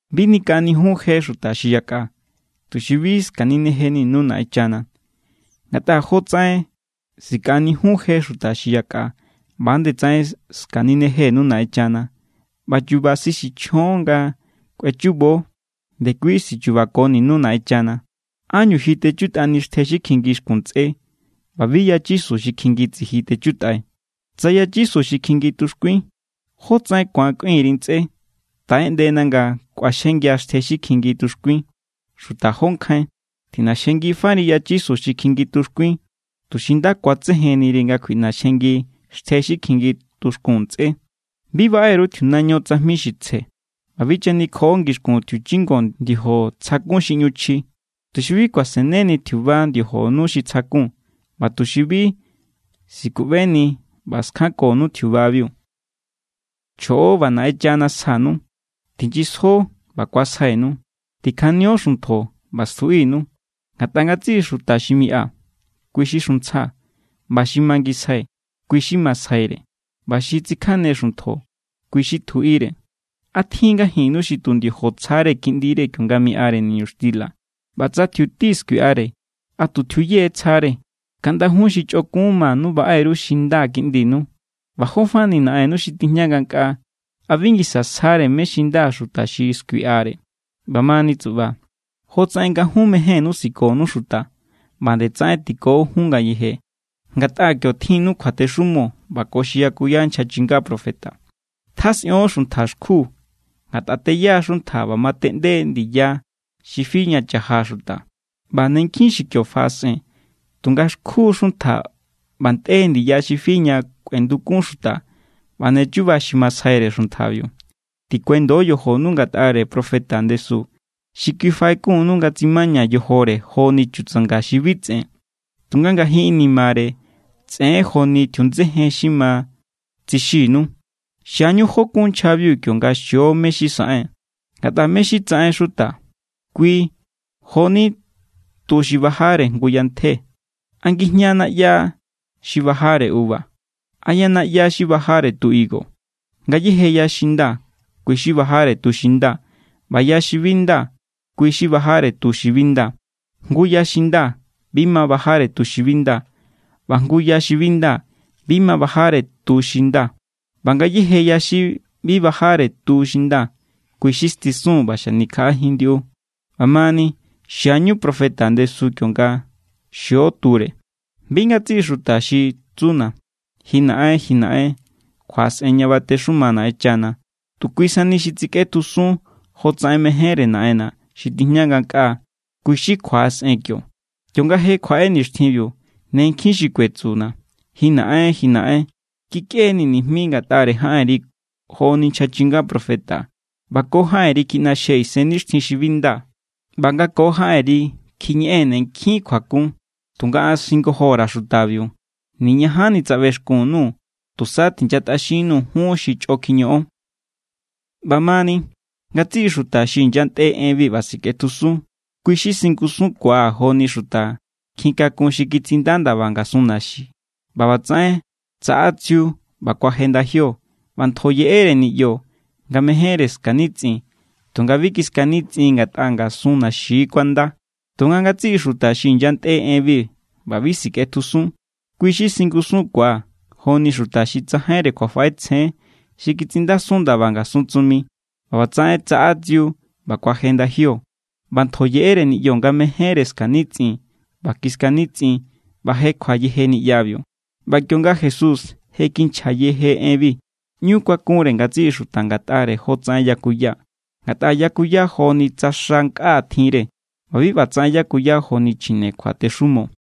’Bi nikaꞌanijiun je xuta xi yakꞌa, tuxi bi skaninejeninu Naꞌenchana. Ngatꞌa jotsaꞌen sikaꞌanijiun je xuta xi yakꞌa, ꞌba=nde tsaꞌen skaninejenu Naꞌenchana. ꞌBa chu̱ba̱ xi sichjon nga kꞌuechubo, ndekui sichubakoninu Naꞌenchana. ¿Ánñu ji techutꞌani xtje xi kjingi xkun ntsꞌé ꞌba bi yachisu xi kjingi tsiji techutꞌai? Tsa yachisu xi kjingi tuxkuin, ¿jó tsaꞌen ku̱an kꞌuin_ri ntsꞌé: “Taꞌeꞌndena nga kꞌuaxjengia̱ xtje xi kjingi tuxkuin”? ¡Xuta jó nkjain! Tjiꞌnaxjengifari yachisu xi kjingi tuxkuin, tuxi nda ku̱atsejenniri nga kjuiꞌnaxjengi xtje xi kjingi tuxkun ntsꞌé. ’Bi baꞌe_ru tjiunaño tsajmi xi tsje, ꞌba bi chanikjoꞌo ngixkun tjiuchingo ndiojo tsjakun xi ꞌñu chji, tuxi bi kuaseneni tjiuba ndiojonu xi tsjakun, ꞌba tuxi bi sikuꞌbeni ꞌba skjankonu tjiubabiu. ’Chjoꞌo, ꞌba Naꞌenchana sjanu. Tinyisjo, ꞌba ku̱asjainu. Tikjanio xuntjo, ꞌba stjuꞌinu. Ngatꞌa ngatsiꞌi xuta xi miꞌa, kui= xi xuntsja. ꞌBa xi mangisjai, kui= xi masjaire. ꞌBa xi tsikjane xuntjo, kui= xi tjuꞌire. ’¿A tjin ngajinnu xi tu ndiojo= tsjare kiꞌndire, kionga miꞌare niñuxtila? ꞌBa tsa tjiuti skuiꞌare, ¿a tu tjiuye tsjare? Kaꞌnda jun xi chꞌokun manu baꞌe_ru xi nda kiꞌndinu. ꞌBa jó fani Naꞌennu xi tijña ngankꞌaa, ¿a bi ngisa sjare mé= xi nda xuta xi skuiꞌare? ’ꞌBa mani tsuꞌba, jotsaꞌen nga jun mejénnú sikonu xuta, ꞌba=nde tsaꞌen tiko jun ngayeje. Ngatꞌa kio tjinnu kjuatexumo ꞌba ko xi yakuya nchja chinga profeta. ’Tjasꞌion xuntja xkju. Ngatꞌa teya= xuntja ꞌba mateꞌnde= ndiya xi fi ña cha̱ja xuta, ꞌba= ne nkjin xi kio faꞌasꞌen. Tunga xkju= xuntja ꞌba ntꞌe= ndiya xi fi ña kꞌuendukun xuta, ꞌba ne chuba xi masjaire xuntjabiu. ’Tikuendo yojonu ngatꞌare profeta ndesu. Kui xi faꞌekunnu nga tsimaña yojore joni chutsanga xi bi tsꞌen, tunga ngajin inimare tsꞌen= joni tjiundsejen xi ma tsixinu. Xiañu jó kun nchjabiu kionga xio mé= xi saꞌen. Ngatꞌa mé= xi tsaꞌen xuta, kui jo=ni tu xi bajare jngu yantje. ¿A ngijña naꞌya xi bajare uva? ¿A yanaꞌya xi bajare tu higo? Ngayéje ya xi nda, kui= xi bajare tu xi nda. ꞌBa ya xi bi nda, kui= xi bajare tu xi bi nda. Jngu ya xi nda, bi ma bajare tu xi bi nda. ꞌBa jngu ya xi bi nda, bi ma bajare tu xi nda. ꞌBa ngayéje ya xi bi bajare tu xi nda, kui= xi stisun ꞌba xanikjaꞌajin ndiꞌu. ꞌBa mani, xiañu profeta ndesu kionga xio ture. ’Bi ngatsiꞌi xuta xi tsuna̱: “Ji Naꞌen, ji Naꞌen”, kjuaꞌasꞌen ña batexuma Naꞌenchana. Tu kui sani xi tsikꞌetjusun jotsaꞌen mejénre Naꞌenna̱ xi tijña ngankꞌaa, kui= xi kjuaꞌasꞌen kio. Kionga je kjuaꞌe nixtjinbiu, ne nkjin xi kuetsuna̱: “Ji Naꞌen, ji Naꞌen, kikꞌe_nii̱ nijmi ngatꞌare jaꞌenri joni nchja chinga profeta, ꞌba ko jaꞌenri kjiꞌnaxjee̱ isennixtjin xi bi nda, ꞌba nga ko jaꞌenri kjiñeꞌee̱n ne nkjin kjuakun.” Tunga an singojo_ra̱ xutabiu: “Niñajanni tsaꞌbexkun_nuu̱. Tusa tinyantꞌaxinnu jun xi chꞌo kjiñoꞌon.” ’ꞌBa mani, ngatsiꞌi xuta xi inyantꞌe enbi ꞌba sikꞌetjusun, kui= xi singusunkuaa̱ joni xuta nkjin kakun xi kitsinda ndaba ngasun naxi. ꞌBa ꞌbatsaꞌen tsaꞌa tsiu, ꞌba kuaje ndajio, ꞌba ntjo yeꞌere niꞌyo nga mejénre skanitsꞌin. Tunga bi kiskanitsꞌin ngatꞌa ngasun naxi= kuanda. Tunga ngatsiꞌi xuta xi inyantꞌe enbi ꞌba bi sikꞌetjusun, kui= xi singusunkuaa̱ joni xuta xi tsajainre kjuafaꞌetsjen xi kitsinndasun ndaba ngasun tsumi. ꞌBa ꞌbatsaꞌen tsaꞌa tsiu, ꞌba kuaje ndajio, ꞌba ntjo yeꞌere niꞌyo nga mejénre skanitsꞌin. ꞌBa kiskanitsꞌin ꞌba jekjua yeje niꞌyabiu. ꞌBa kionga Jesús je kinchja yeje enbi, ꞌñu kuakunre ngatsiꞌi xuta ngatꞌare jotsaꞌen yakuya. Ngatꞌa yakuya joni tsa xa nkꞌa tjinre. ꞌBa bi ꞌbatsaꞌen yakuya joni chjine kjuatexumo.